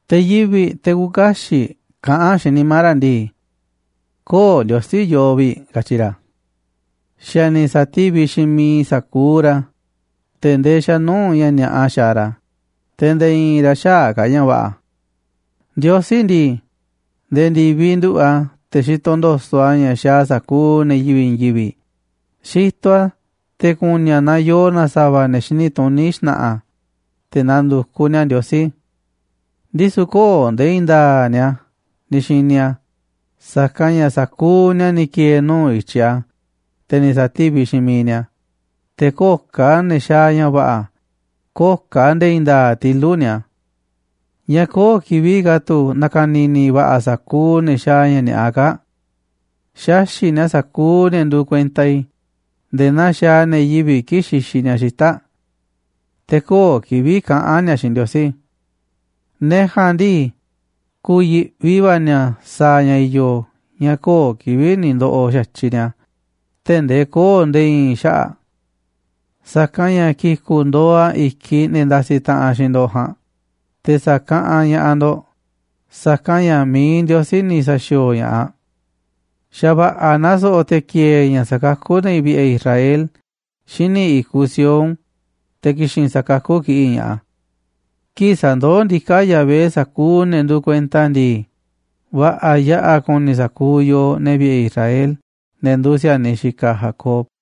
Te̱ yivi̱ꞌ, te̱ küuꞌ kaxiꞌ kaꞌán xiinꞌ nimá ra̱ ndii: “Köo̱ꞌ Ndiosí yoo vi̱ꞌ”, katyi ra̱. Xa̱ ni̱ sa̱tíviꞌ xiinꞌ miiꞌ sa̱kuuꞌ ra̱, te̱ ndee xa̱ nuu̱ꞌ ña̱ ni̱a̱ꞌa xaaꞌ ra̱, te̱ nde̱e̱ i̱i̱n ra̱ xäaꞌ ka̱ ña̱ va̱ꞌa̱. Ndiosí ndii, nde̱e̱ ndi̱viꞌ nduꞌu̱ꞌ a̱ te̱ xitoꞌ ndo̱so̱ꞌ a̱ ña̱ xaaꞌ sa̱kuuꞌ ne̱ yivi̱ꞌ i̱i̱n yivi̱ꞌ, xitoꞌ a̱ te̱ ku̱ni̱ a̱ naaꞌ yoo na sa̱va̱ ne̱ xini tuní xna̱ꞌa̱, te̱ na̱ndu̱kuꞌ ni̱a̱ Ndiosí. Ndisu̱ köo̱ꞌ nde̱e̱ i̱i̱n nda̱a̱ꞌ ni̱a̱ ni̱ xini a̱, sa̱kanꞌ ña̱ sa̱kuuꞌ ni̱a̱ ni̱ ki̱e̱e̱ nuu̱ꞌ i̱tyiꞌ a̱, te̱ ni̱ sa̱tíviꞌ xiinꞌ miiꞌ ni̱a̱, te̱ köo̱ꞌ ka̱ ne̱ xaaꞌ ña̱ va̱ꞌa̱, köo̱ꞌ ka̱ nde̱e̱ i̱i̱n nda̱a̱ꞌ tilu̱ꞌ ni̱a̱. ¿Ñáá köo̱ꞌ kivi̱ꞌ ka̱ tu̱ na̱ka̱ni̱ni̱ va̱ꞌa̱ sa̱kuuꞌ ne̱ xaaꞌ ña̱ ni̱a̱ꞌa kaa̱ꞌ? Xaxi̱ꞌ ni̱a̱ sa̱kuuꞌ ne̱ nduuꞌ kuenta i̱ nde̱e̱ naa xaaꞌ ne̱ yivi̱ꞌ kii̱ꞌ xixiꞌ ni̱a̱ xita̱ꞌ. Te̱ köo̱ꞌ kivi̱ꞌ kaꞌán ni̱a̱ xiinꞌ Ndiosí. Ne̱ ja̱a̱nꞌ ndii, ku̱yi̱ꞌvi va̱ ni̱a̱ sa̱a̱ ña̱ i̱yo̱ ña̱ köo̱ꞌ kivi̱ꞌ ni̱ ndo̱ꞌo̱ xa̱tyiꞌ ni̱a̱ tee̱ꞌ ndee köo̱ꞌ nde̱e̱ i̱i̱n xaꞌa̱ꞌ. Sa̱kanꞌ ña̱ ki̱ku̱ꞌ ndo̱o̱ a̱ i̱kiꞌ ne̱ ndasiꞌ taꞌanꞌ xiinꞌ ndo̱ꞌ ja̱a̱nꞌ, te̱ sa̱kaꞌanꞌ ña̱ꞌaꞌ ndo̱ꞌ, sa̱kanꞌ ña̱ mi̱iꞌ Ndiosí ni̱ sa̱xi̱o̱o̱ ña̱ꞌaꞌ. Xa̱ va̱ꞌa̱ naaꞌ so̱ꞌo̱ te̱ ki̱e̱e̱ ña̱ sa̱kakú ne̱ vi̱ꞌe̱ Israel xíniꞌ i̱kuꞌ Sión, te̱ ki̱xi̱n sa̱kakú kiꞌi̱ꞌ ña̱ꞌaꞌ a̱. Kii̱ꞌ sa̱ndoó ndiká Yahvé sa̱kuuꞌ ne̱ nduuꞌ kuenta a̱ ndii, va̱ꞌa̱ yaꞌa̱ ku̱ni̱ sa̱kuuꞌ yooꞌ, ne̱ vi̱ꞌe̱ Israel, ne̱ nduuꞌ si̱a̱niꞌ xikaꞌ Jacob.